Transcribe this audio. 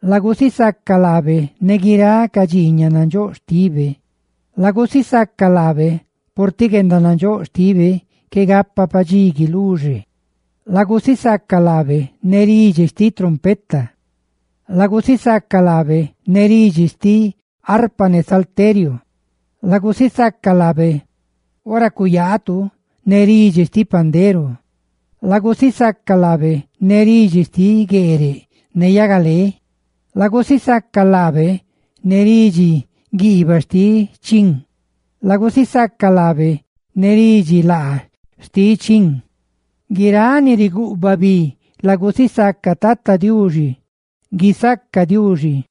¡Lagusisaca laabe ne guiráꞌ ca dxiiñaꞌ nandxóꞌ xtibe! ¡Lagusisaca laabe purtiꞌ guendanandxóꞌ xtibe qué gapa padxí guiluxe! ¡Lagusisaca laabe ne ridxi xtiꞌ trompeta! ¡Lagusisaca laabe ne ridxi xtiꞌ arpa ne salteriu! ¡Lagusisaca laabe ora cuyaatu ne ridxi xtiꞌ pandero! ¡Lagusisaca laabe ne ridxi xtiꞌ gueereꞌ ne yagalé! ¡Lagusisaca laabe ne ridxi guiibaꞌ xtiꞌ chin! ¡Lagusisaca laabe ne ridxi laa xtiꞌ chin! ¡Guiráꞌ ni ricaa bi lagusisaca Tata Diuxi! ¡Guisaca Diuxi!